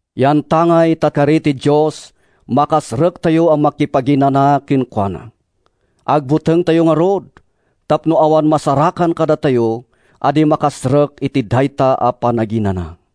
Yantangay ta kari ti Dios a makastrektayo a makipaginana kenkuana, agbutengtayo ngarud tapno awan masarakan kadakayo a di makastrek iti dayta a panaginana.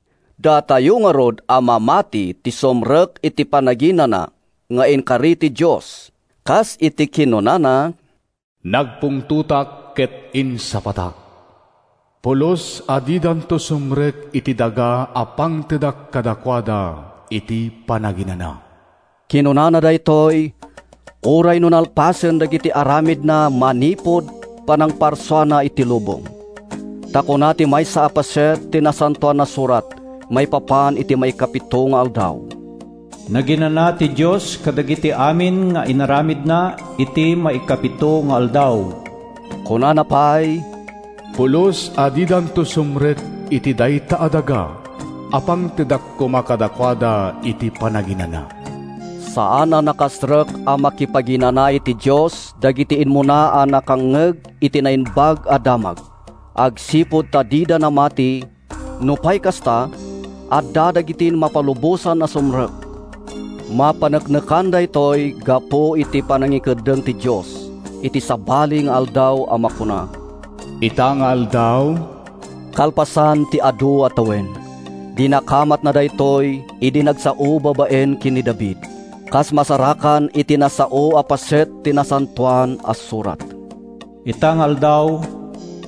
Datayo ngarud a mamati ti sumrek iti panaginana nga inkari ti Dios. Kas iti kinunana, “Nagpungtotak ket insapatak: ‘Pulos a didanto sumrek iti daga a pangtedak kadakuada iti panaginana!’” Kinunana daytoy uray no nalpasen dagiti aramidna manipud panangparsuana iti lubong. Ta kuna ti maysa a paset ti Nasantoan a Surat maipapan iti maikapito nga aldaw: “Naginana ti Dios kadagiti amin nga aramidna iti maikapito nga aldaw.” Kunana pay: “Pulos a didanto sumrek iti dayta a daga a pangtedak koma kadakuada iti panaginana.” Saan a nakastrek a makipaginana iti Dios dagiti immuna a nakangngeg iti Naimbag a Damag agsipud ta dida namati Nupay kasta, adda dagiti mapalubosan a sumrek. Mapaneknekan daytoy gapu iti panangikeddeng ti Dios iti sabali nga aldaw a makuna, “Ita nga aldaw.” Kalpasan ti adu a tawen, dinakamatna daytoy idi nagsao babaen ken ni David, kas masarakan iti nasao a paset ti Nasantoan a Surat, “Ita nga aldaw,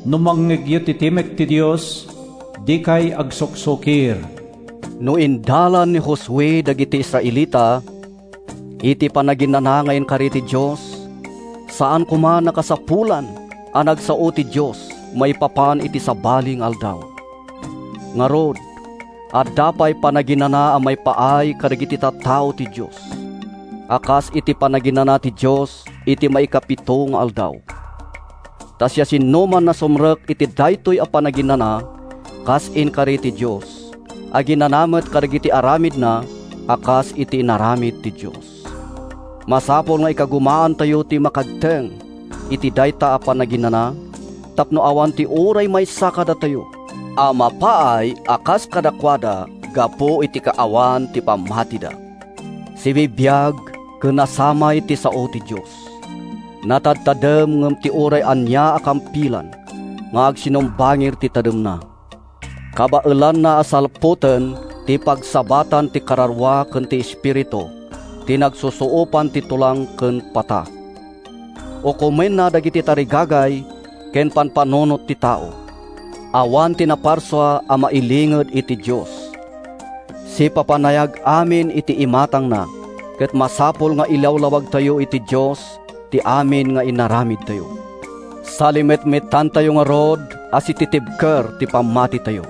no mangngegyo ti timek ti Dios, Dikay agsuksukir.” No indalan ni Josue dagiti Israelita iti panaginana nga inkari ti Dios, saan koman a kasapulan a nagsao ti Dios maipapan iti sabali nga aldaw. Ngarud, adda pay panaginana a maipaay kadagiti tattao ti Dios, a kas iti panaginana ti Dios iti maikapito nga aldaw. Ta siasinoman a sumrek iti daytoy a panaginana kas inkari ti Dios, aginana met kadagiti aramidna a kas iti inaramid ti Dios. Masapul nga ikagumaantayo ti makagteng iti dayta a panaginana tapno awan ti uray maysa kadatayo a mapaay a kas kadakuada gapu iti kaawan ti pammatida. Sibibiag ken nasamay ti sao ti Dios. Natadtadem ngem ti uray ania a kampilan nga agsumbangir ti tademna. Kabaelanna a salputen ti pagsabatan ti kararua ken ti espiritu, ti nagsusuopan ti tulang ken pata. Ukomenna dagiti tarigagay ken pampanunot ti tao. Awan ti naparsua a mailinged iti Dios. Sipapanayag amin iti imatangna, ket masapul nga ilawlawagtayo iti Dios ti amin nga inaramidtayo. Salimetmetantayo ngarud a sititibker ti pammatitayo.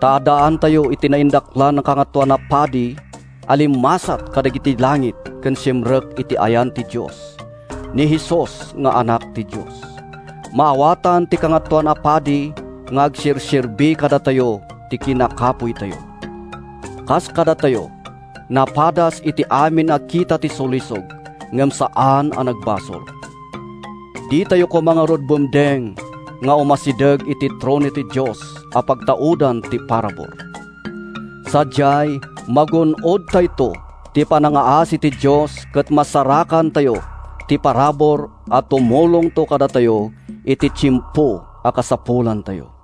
Ta addaantayo iti naindaklan a Kangatoan a Padi a limmasat kadagiti langit ken simrek iti ayan ti Dios—ni Jesus nga Anak ti Dios. Maawatan ti Kangatoan a Padi nga agserserbi kadatayo ti kinakapuytayo. Kas kadatayo, napadas iti amin a kita ti sulisog ngem saan a nagbasol. Ditayo koma ngarud bumdeng nga umasideg iti trono ti Dios a pagtaudan ti parabur. Sadiay, magun-odtayto ti panangngaasi ti Dios ket masarakantayo ti parabur a tumulongto kadatayo iti tiempo a kasapulantayo.